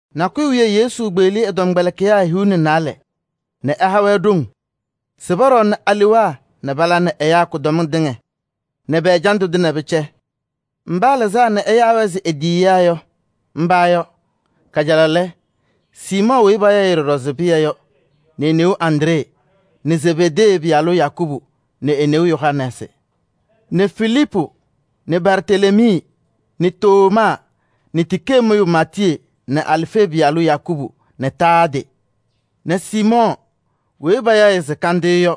Nakʋyʋ wiye Yesu kpeɣli ɛ-tɔmkpɛlɩkɩyaa hiu nɛ naalɛ nɛ ɛha-wɛ ɖoŋ se pɔɖɔɔnɩnɩ alewaa nɛ pala nɛ ɛyaa kʋdɔmɩŋ tɩŋa nɛ pɛ-ɛjandʋ tɩŋa pɛcɛ. Mba ɛlɩzaa nɛ ɛyaa-wɛ se e-tiyiyaa yɔ, mba yɔ: kajalaɣ lɛ, Siimɔɔ weyi payaɣ ɖɔɖɔ se Pɩyɛ yɔ nɛ e-neu Andree nɛ Zebedee pɩyalaa Yakubu nɛ e-neu Yohanɛɛsɩ nɛ Filiipu nɛ Bartelemii nɛ Tomaa nɛ tikee mʋyʋ Maatiyee nɛ Alfee pɩyalʋ Yakubu nɛ Taadee nɛ Siimɔɔ weyi payaɣ se Yɔɔ Kandɩyʋ yɔ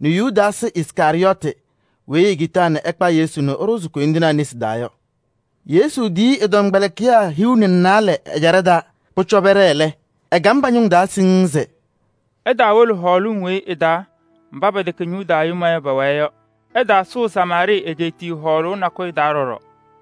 nɛ Yudaasɩ Iskarɩyɔɔtɩ weyi ekitaa ɛkpa Yesu nɛ ɛɖʋzɩ koyindinaa nesi taa yɔ. Yesu tɛm ɛ-tɔmkpɛlɩkɩyaa hiu nɛ naalɛ mba ɖoŋ haʋ lɛ, etiyi-wɛ se: “Iwolo Izrɛɛlɩ ñɩma mba pɛwɛ ɛzɩ heŋ kilebiŋ weyi ɩfɛyɩnɩ ninɖiɣyu yɔ pɔ-cɔlɔ. Ɛlɛ, ɩtaawolo hɔɔlɩŋ weyi ɩ-taa mba pɛtɛkɛ Yuda ñɩma yɔ, pɛwɛɛ yɔ. Ɩtaasʋʋ Samaarɩɩ egeetiye hɔɔlʋʋ nakʋyʋ taa ɖɔɖɔ.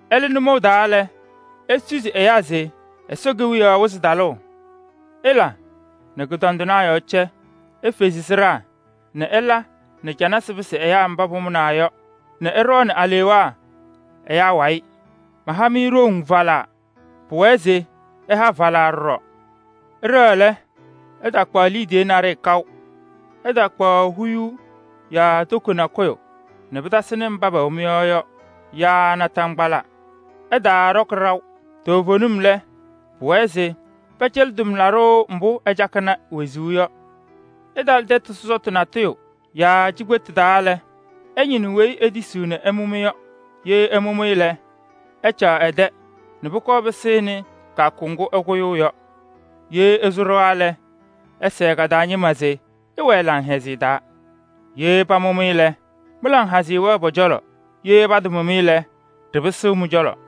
Ɩlɩ nʋmɔʋ taa lɛ, isusi ɛyaa se Ɛsɔ Kewiyaɣ wɩzɩ talʋʋ. Ɩla nɛ kʋdɔndɩnaa yɔɔ cɛ. Ifezi sɩɖaa nɛ ɩla nɛ canasɩ pɩsɩ ɛyaa mba pamʋnaa yɔ nɛ ɩɖɔɔnɩ alewaa ɛyaa wayɩ. Maha-mɩ ɖoŋ falaa, pʋwɛɛ se ɩha falaa ɖɔɖɔ. Ɩɖɛɣ lɛ, ɩtaakpaɣ liidiye naɖɩyɛ kaʋ. Ɩtaakpaɣ huyuu yaa toko nakʋyʋ nɛ pɩtasɩnɩ mba pɛwɛ mɩ-yɔɔ yɔ yaa naataŋgbala, ɩtaaɖɔkɩ ɖaʋ. Toovenim lɛ, pʋwɛɛ se pɛcɛlɩ tʋmlaɖʋ mbʋ ɛcakɩnɩ wezuu yɔ. Ɩtalɩ tɛtʋ sɔsɔtʋ yaa cikpetu natʋyʋ taa lɛ, ɩñɩnɩ weyi etisiɣ nɛ ɛmʋ-mɩ yɔ. Ye ɛmʋ-mɩ lɛ, ɩcaɣ ɛ-tɛ nɛ pʋkɔɔ pɩsɩnɩ kɩyakʋ ŋgʋ ɩkʋyʋʋ yɔ. Ye ɩsʋ ɖɩɣa lɛ, ɩsɛɛ ka-taa ñɩma se: ‘Ɩwɛɛ laŋhɛzɩyɛ taa!’ Ye pamʋ-mɩ lɛ, mɩ-laŋhɛzɩyɛ wɛɛ pɔ-cɔlɔ. Ye patamʋ-mɩ lɛ, ɖɩpɩsɩ mɩ-cɔlɔ.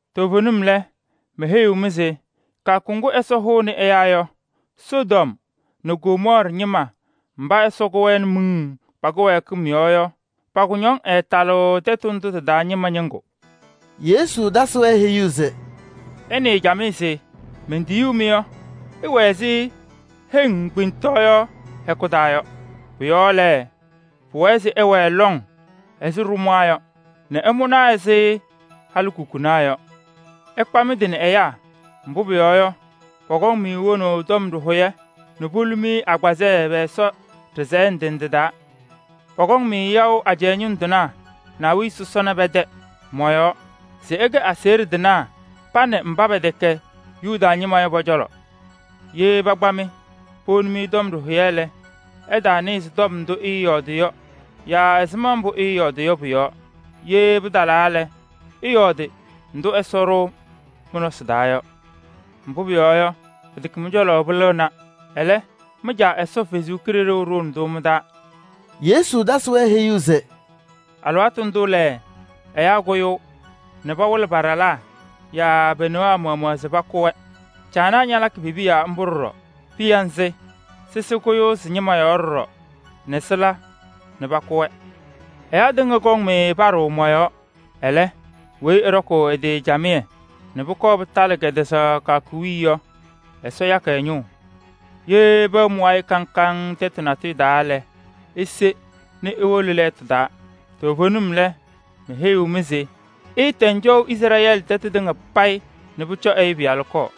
Toovenim lɛ, meheyiɣ-mɩ se kɩyakʋ ŋgʋ Ɛsɔ hʋʋnɩ ɛyaa yɔ, Sodom nɛ Gomɔɔrɩ ñɩma mba Ɛsɔ kʋ-wɛ nɛ miŋ pa-kɩwɛɛkɩm yɔɔ yɔ, pa-kʋñɔŋ ɛɛtalɩɣ tɛtʋ ndʋ tɩ-taa ñɩma ñɩŋgʋ.” Yesu tasɩ-wɛ heyuu se: “Ɩnɩɩ camɩyɛ se mentiyuu-mɩ yɔ, ɩwɛ ɛzɩ heŋ wɛɣʋ kpemtɔɔyɩsɩ hɛkʋ taa yɔ. Pʋ-yɔɔ lɛ, pʋwɛɛ se ɩwɛɛ lɔŋ ɛzɩ ɖʋmaa yɔ nɛ ɩmʋna ɛzɩ halikukunaa yɔ. Ɩkpa mɩ-tɩ nɛ ɛyaa, mbʋ pʋyɔɔ yɔ, pɔkɔŋ-mɩ wonaʋ tɔm ɖɩhʋyɛ nɛ polu-mɩ agbazɛɛ pɛ-Ɛsɔ ɖɩsɛyɛ ndɩ ndɩ taa. Pɔkɔŋ-mɩ yaʋ ajɛɛ ñʋŋ tɩnaa nɛ awiya sɔsɔna pɛ-tɛ mɔ-yɔɔ se ɩkɛ aseɣɖe tɩnaa pa nɛ mba pɛtɛkɛ Yuda ñɩma yɔ pɔ-cɔlɔ. Ye pakpa-mɩ powoni tɔm ɖɩhʋyɛ lɛ, ɩtaanɩɣzɩ tɔm ndʋ ɩɩyɔɔdɩ yɔ yaa ɛzɩma mbʋ ɩɩyɔɔdɩ yɔ pʋ-yɔɔ. Ye pɩtalaa lɛ, ɩyɔɔdɩ ndʋ Ɛsɔ ɖʋʋ mɩ-nɔsɩ taa yɔ. Mbʋ pʋyɔɔ yɔ, pɩtɛkɛ mɩ-cɔlɔ pɩlɩɣna, ɛlɛ, mɩ-Caa Ɛsɔ Kalɩzaɣ ɖʋʋnɩ-tʋ mɩ-taa.” Yesu tasɩ-wɛ heyuu se: “Alɩwaatʋ ndʋ lɛ, ɛyaa kʋyʋʋ nɛ pawɩlɩ pa-ɖalaa yaa pe-newaa maɣmaɣ se pakʋ-wɛ. Caanaa ñalakɩ pe-piya mbʋ ɖɔɖɔ. Piya nzɩ, sɩsɩ kʋyɩ sɩ-ñɩma yɔɔ ɖɔɖɔ nɛ sɩla nɛ pakʋ-wɛ. “Ɛyaa tɩŋa kɔŋ-mɩ paɖʋʋ mɔ-yɔɔ. Ɛlɛ, weyi ɛɖɔkʋʋ ɛ-tɩ camɩyɛ nɛ pʋkɔɔ pɩtalɩ kɛtɛzaɣ kɩyakʋ wiye yɔ, Ɛsɔ yakɩ ɛ-ñʋʋ. Ye pɛwɛ mɩ-wayɩ kaŋ kaŋ tɛtʋ natʋyʋ taa lɛ, ise nɛ iwolo lɛɛtʋ taa. Toovenim lɛ, meheyiɣ-mɩ se ɩɩtɛŋ cɔʋ Izrɛɛlɩ tɛtʋ tɩŋa payɩ nɛ pʋcɔ Ɛyʋ Pɩyalʋ kɔɔ.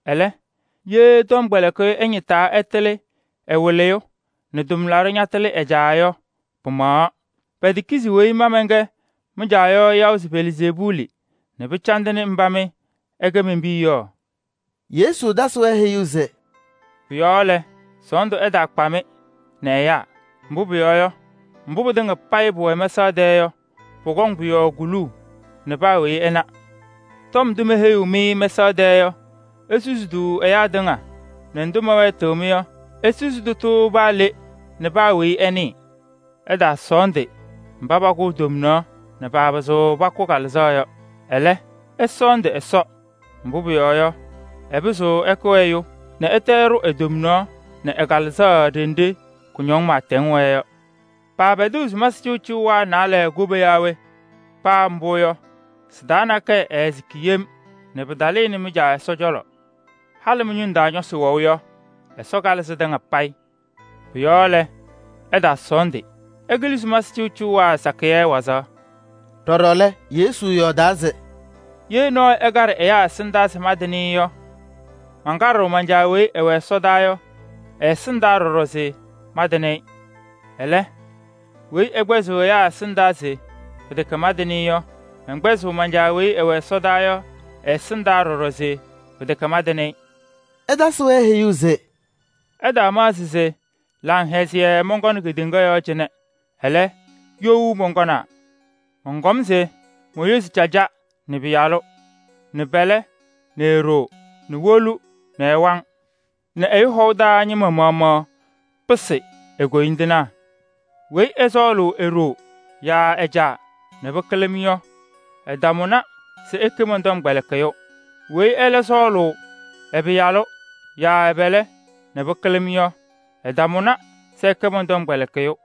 Ɛlɛ, ye tɔmkpɛlɩkɩyʋ ɛñɩtaa ɛtalɩ ɛ-wɩlɩyʋ nɛ tʋmlaɖʋ ñatalɩ ɛlɛ caa yɔ, pɩmaɣaɣ. Petekizi weyi ma mɛnkɛ mɩ-caa yɔ yaʋ se Belzeebuuli nɛ pɩcandɩnɩ mba mɩ ɩkɛ men-piya yɔ?” Yesu tasɩ-wɛ heyuu se: “Pʋ-yɔɔ lɛ, sɔɔndʋ ɛɛtaakpa-mɩ nɛ ɛyaa. Mbʋ pʋyɔɔ yɔ, mbʋ pɩtɩŋa payɩ pʋwɛ mɛsaɣ tɛɛ yɔ, pɔkɔŋ pʋ-yɔɔ kuluu nɛ paa weyi ɛna. Tɔm ndʋ meheyiɣ-mɩ mɛsaɣ tɛɛ yɔ, isusi-tʋ ɛyaa tɩŋa nɛ ndʋ mɛwɛɛtɩɣ-mɩ yɔ, isusi tʋtʋ paa le nɛ paa weyi ɛnɩɩ. Ɩtaasɔɔndɩ mba pakʋʋ tomnaɣ nɛ paapɩzɩɣ pakʋ kalɩzaɣ yɔ. Ɛlɛ, ɩsɔɔndɩ Ɛsɔ, mbʋ pʋyɔɔ yɔ, ɛpɩzɩɣ ɛkʋ ɛyʋ nɛ ɛtɛ ɛɖʋ e-tomnaɣ nɛ ɛ-kalɩzaɣ ɖenɖe kʋñɔŋ pɩɩtɛŋ wɛɛ yɔ. Paapɛdɩɣ sumasɩ cɩʋcɩʋwaa naalɛ koba yaa we? Paa mbʋ yɔ, sɩ-taa nakɛyɛ ɛɛsɩkɩ yem nɛ pɩtalɩnɩ mɩ-Caa Ɛsɔ cɔlɔ. Halɩ mɩ-ñʋŋ taa ñɔsɩ wɛʋ yɔ, Ɛsɔ kalɩ sɩtɩŋa payɩ. Pʋ-yɔɔ lɛ, ɩtaasɔɔndɩ. Ɩkɩlɩ sumasɩ cɩʋcɩʋwaa sakɩyɛ wazaɣ.” Ɖɔɖɔ lɛ, Yesu yɔɔdaa se: “Ye nɔɔyʋ ɛkaɖɩ ɛyaa taa se mantɩnɩ-ɩ yɔ, mankaɖɩɣ man-Caa weyi ɛwɛ ɛsɔdaa yɔ ɛ-ɛsɩndaa ɖɔɖɔ se mantɩnɩ-ɩ. Ɛlɛ, weyi ɛkpɛzɩɣ ɛyaa ɛsɩndaa se pɩtɛkɛ mantɩnɩ-ɩ yɔ, mɛnkpɛzɩɣ man-Caa weyi ɛwɛ ɛsɔdaa yɔ ɛ-ɛsɩndaa ɖɔɖɔ se pɩtɛkɛ mantɩnɩ-ɩ.” Ɛtasɩ-wɛ heyuu se: “Ɩtaamaɣzɩ se laŋhɛzɩyɛ mɔnkɔnɩ kedeŋa yɔɔ cɩnɛ. Ɛlɛ, you mɔnkɔnaa. Mɔnkɔm se moyozi caja nɛ ɛ-pɩyalʋ, nɛ pɛlɛ nɛ e-ɖoo, nɛ wolu nɛ ɛ-waŋ, nɛ ɛyʋ hɔʋ taa ñɩma maɣmaɣ pɩsɩ e-koyindinaa. “Weyi ɛsɔɔlʋʋ e-ɖoo yaa ɛ-caa nɛ pɩkɩlɩ-m yɔ, ɛtamʋnɩ se ɛkɛ mɔn-tɔmkpɛlɩkɩyʋ. Weyi ɛlɛ sɔɔlʋʋ ɛ-pɩyalʋ yaa ɛ-pɛlɛ nɛ pɩkɩlɩ-m yɔ, ɛtamʋnɩ se ɛkɛ mɔn-tɔmkpɛlɩkɩyʋ.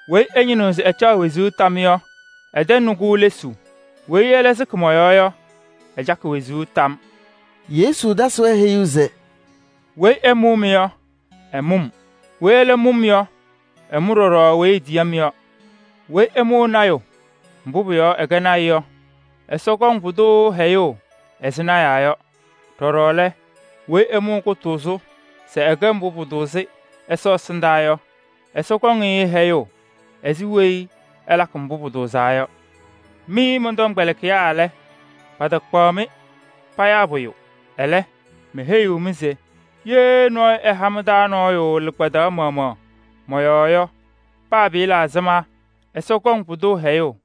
Weyi ɛñɩnɩɣ se ɛcaɣ wezuu tam yɔ, ɛtɛŋnɩ-kʋ lesuu. Weyi ɛlɛ sɩkɩ mɔ-yɔɔ yɔ, ɛcakɩ wezuu tam.” Yesu tasɩ-wɛ heyuu se: “Weyi ɛmʋʋ-mɩ yɔ, ɛmʋʋ-m. Weyi ɛlɛ mʋʋ-m yɔ, ɛmʋʋ ɖɔɖɔ weyi etiyi-m yɔ. Weyi ɛmʋʋ lɔɔyaɣ tʋ ɛ-lɔɔyaɣ yɔɔ yɔ, Ɛsɔ kɔŋ pʋdʋ hɛyʋʋ ɛzɩ lɔɔyɩsɩ tɩnaa yɔ. Ɖɔɖɔ lɛ, weyi ɛmʋʋ kʋtʋʋzʋ se ɛlakɩ mbʋ pʋtʋʋzɩ Ɛsɔ ɛsɩndaa yɔ, Ɛsɔ kɔŋ-ɩ hɛyʋʋ ɛzɩ weyi ɛlakɩ mbʋ pʋtʋʋzaa yɔ. Mɩ mɔn-tɔmkpɛlɩkɩyaa lɛ, patakpaɣ-mɩ payaa pʋyʋ. Ɛlɛ, meheyiɣ-mɩ se ye nɔɔyʋ ɛha mɩ-taa nɔɔyʋ lɩkpadaɣ maɣmaɣ mɔ-yɔɔ yɔ, paa pɩɩla ɛzɩma, Ɛsɔ kɔŋ pʋdʋ hɛyʋʋ.”